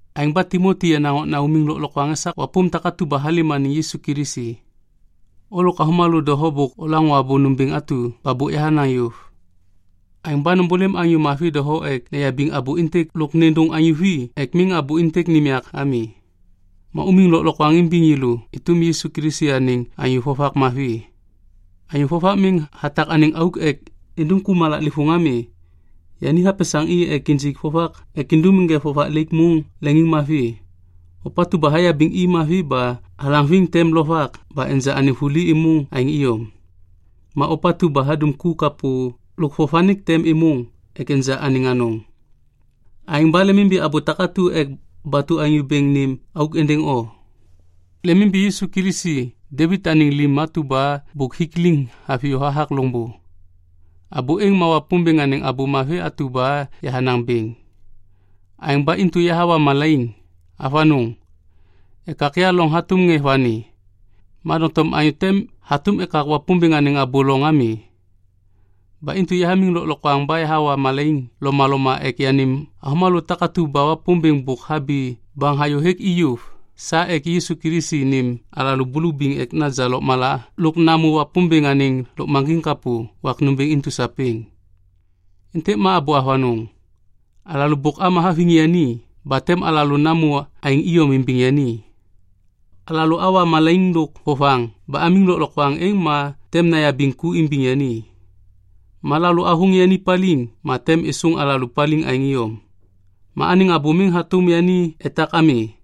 Aêŋ ba Timoti yenaŋ okna umiŋ lôklokwaŋ esak wapôm takatu ba halêm anêŋ Yisu Kilisi. O lôk avômalô doho bôk olaŋô abô nômbêŋ atu ba bôk yahanaŋ yôv. Aêŋ ba nômbôlêm anyô mavi doho ek neyabiŋ abô êntêk lôk nêndôŋ anyô vi ek miŋ abô êntêk nêm yak ami. Ma umiŋ lôklokwaŋ imbiŋ yêlô êtôm Yisu Kilisi anêŋ anyô vovak mavi. Anyô vovak miŋ hatak anêŋ auk ek indum ku malaklêvôŋ ami. Yani hapesaŋ i ek injik vovak ek indum ŋê vovak laik môŋ leŋiŋmavi. Ôpatu ba hayabiŋ i mavi ba halaŋviŋ tem lovak ba enja anêŋ vuli êmôŋ aêŋ iyom. Ma ôpatu ba hadum ku kapô lôk vovanik tem êmôŋ ek enja anêŋ anôŋ. Aêŋ ba lemimbi abô takatu ek batu Anyô Bêŋ nêm auk êndêŋ o. Lemimbi Yisu Kilisi Devit anêŋ lim atu ba bôk hik liŋ haviyô hathak loŋbô. Abô êŋ ma Wapômbêŋ anêŋ Abô Mavi atu ba yahanaŋ bêŋ. Aêŋ ba intu yahawa malaiŋ. Avanôŋ! Ekak ya loŋ hatôm ŋê vani. Ma doŋtom anyô te hatôm ekak Wapômbêŋ anêŋ abô loŋ ami. Ba intu yahamiŋ lôklokwaŋ ba yahawa malaiŋ lomaloma ek yanêm avômalô takatu ba Wapômbêŋ bôk habi baŋ hayô hêk i yôv sa ek Yisu Kilisi nêm alalô bulubiŋ ek naja lôkmala lôk namô Wapômbêŋ anêŋ lôkmaŋgiŋ kapô wak nômbêŋ intu sapêŋ. Êntêk ma abô avanôŋ. Alalô bôk ama haviŋ yani ba tem alalô namô aêŋ iyom imbiŋ yani. Alalô awa malaiŋ lôk vovaŋ ba amiŋ lôklokwaŋ êŋ ma tem nayabiŋ ku imbiŋ yani. Ma alalô athôŋ yani paliŋ ma tem êsôŋ alalô paliŋ aêŋ iyom. Ma anêŋ abô miŋ hatôm yani etak ami.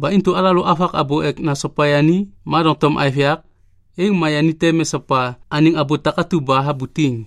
Ba intu alalô avak abô ek nasopa yani ma doŋtom aêv yak, êŋ ma yani tem esopa anêŋ abô takatu ba habutiŋ.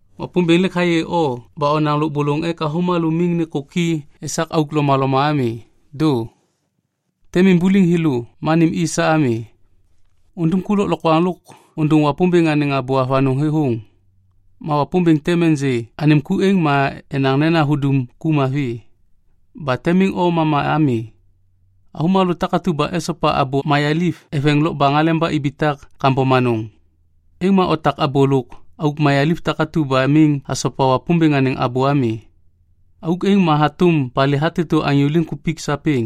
Wapômbêŋ lêk hayê o ba onaŋ lôbôlôŋ ek avômalô miŋ nêkôki esak auk lomaloma ami. Dô. Tem imbuliŋ thêlô ma nêm i sa ami. Undum ku lôklokwaŋ lôk ôndôŋ Wapômbêŋ anêŋ abô avanôŋ thêthôŋ. Ma Wapômbêŋ tem ênjê anêm ku êŋ ma enaŋ nena hudum ku mavi. Ba tem miŋ o mama ami. Avômalô takatu ba esopa abô mayaliv eveŋ lokbaŋ aleba ibitak kambom anôŋ. Êŋ ma otak abô lôk auk mayaliv takatu ba miŋ hasopa Wapômbêŋ anêŋ abô ami. Auk êŋ ma hatôm palê hatêtô anyô liŋkupik sapêŋ.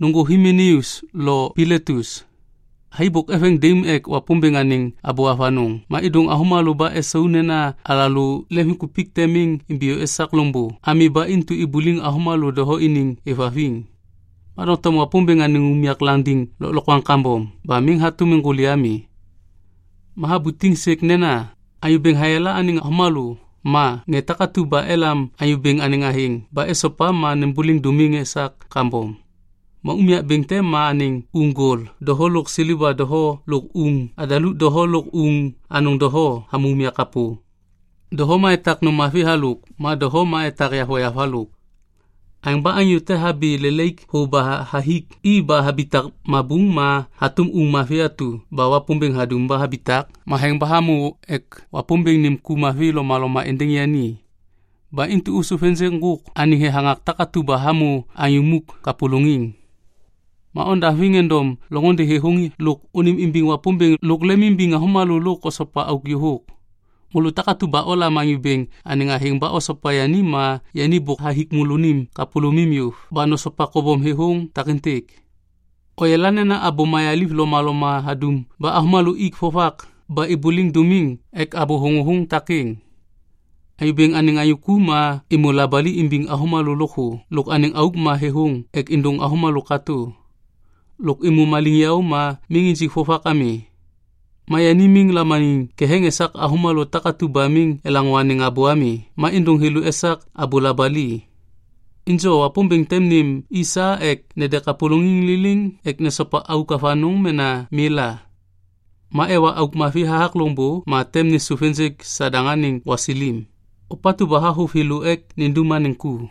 Nôŋgô Himeneus lo Piletus. Thai bôk eveŋ daim ek Wapômbêŋ anêŋ abô avanôŋ ma êdôŋ avômalô ba esau nena alalô leŋviŋkupik tem miŋ imbiyô esak loŋbô ami ba intu ibuliŋ avômalô doho iniŋ êvhaviŋ. Ma doŋtom Wapômbêŋ anêŋ unyak landiŋ lôklokwaŋ kambom ba miŋ hatôm êŋgôli ami. Ma habutiŋ sêk nena, “Anyô Bêŋ hayala anêŋ avômalô” ma “Ŋê takatu ba elam Anyô Bêŋ anêŋ athêŋ ba esopa ma nêmbôliŋ dômiŋ esak kambom.” Ma unyak bêŋ te ma anêŋ uŋ gol doho lôk seleva doho lôk uŋ adaluk doho lôk uŋ anôŋ doho hamô unyak kapô. Doho ma etak nôm mavi halôk ma doho ma etak yavoyav halôk. Aêŋ ba anyô te habi lelaik thô ba hathik i ba habitak mabuŋ ma hatôm uŋ mavi atu ba Wapômbêŋ hadum ba habitak matheŋ ba hamô ek Wapômbêŋ nêm ku mavi lomaloma êndêŋ yani. Ba intu ôsôv ênjêk ŋgôk anêŋ thethaŋak takatu ba hamô anyô muk kapôlôŋiŋ. Ma ondaŋviŋ endom loŋôndê thêthôŋ lôk ônêmimbiŋ Wapômbêŋ lôk lemimbiŋ avômalô lôk osopa auk yôhôk. Môlô takatu ba olam Anyô Bêŋ anêŋ athêŋ ba osopa yani ma yani bôk hathik môlônim kapôlômim yôv ba nosopa kobom thêthôŋ takêntêk. Oyala nena abô mayaliv lomaloma hadum ba avômalô ik vovak ba ômbôliŋ dômiŋ ek abô thôŋôthôŋ takêŋ. Anyô Bêŋ anêŋ anyô ku ma êmô labali imbiŋ avômalô lôkthô lôk anêŋ auk ma thêthôŋ ek êndôŋ avômalô katô. Lôk êmô maliŋyaô ma miŋ injik vovak ami. Ma yani miŋ lamaniŋ ketheŋ esak avômalô takatu ba miŋ elaŋô anêŋ abô ami ma êndôŋ thêlô esak abô labali. Injo Wapômbêŋ tem nêm i sa ek nede kapôlôŋiŋ liliŋ ek nesopa auk avanôŋ mena mi la. Ma ewa auk mavi hathak loŋbô ma tem nêsôv ênjêk Sadaŋ anêŋ gwasilim, ôpatu ba havôv thêlô ek nindum anêŋ ku.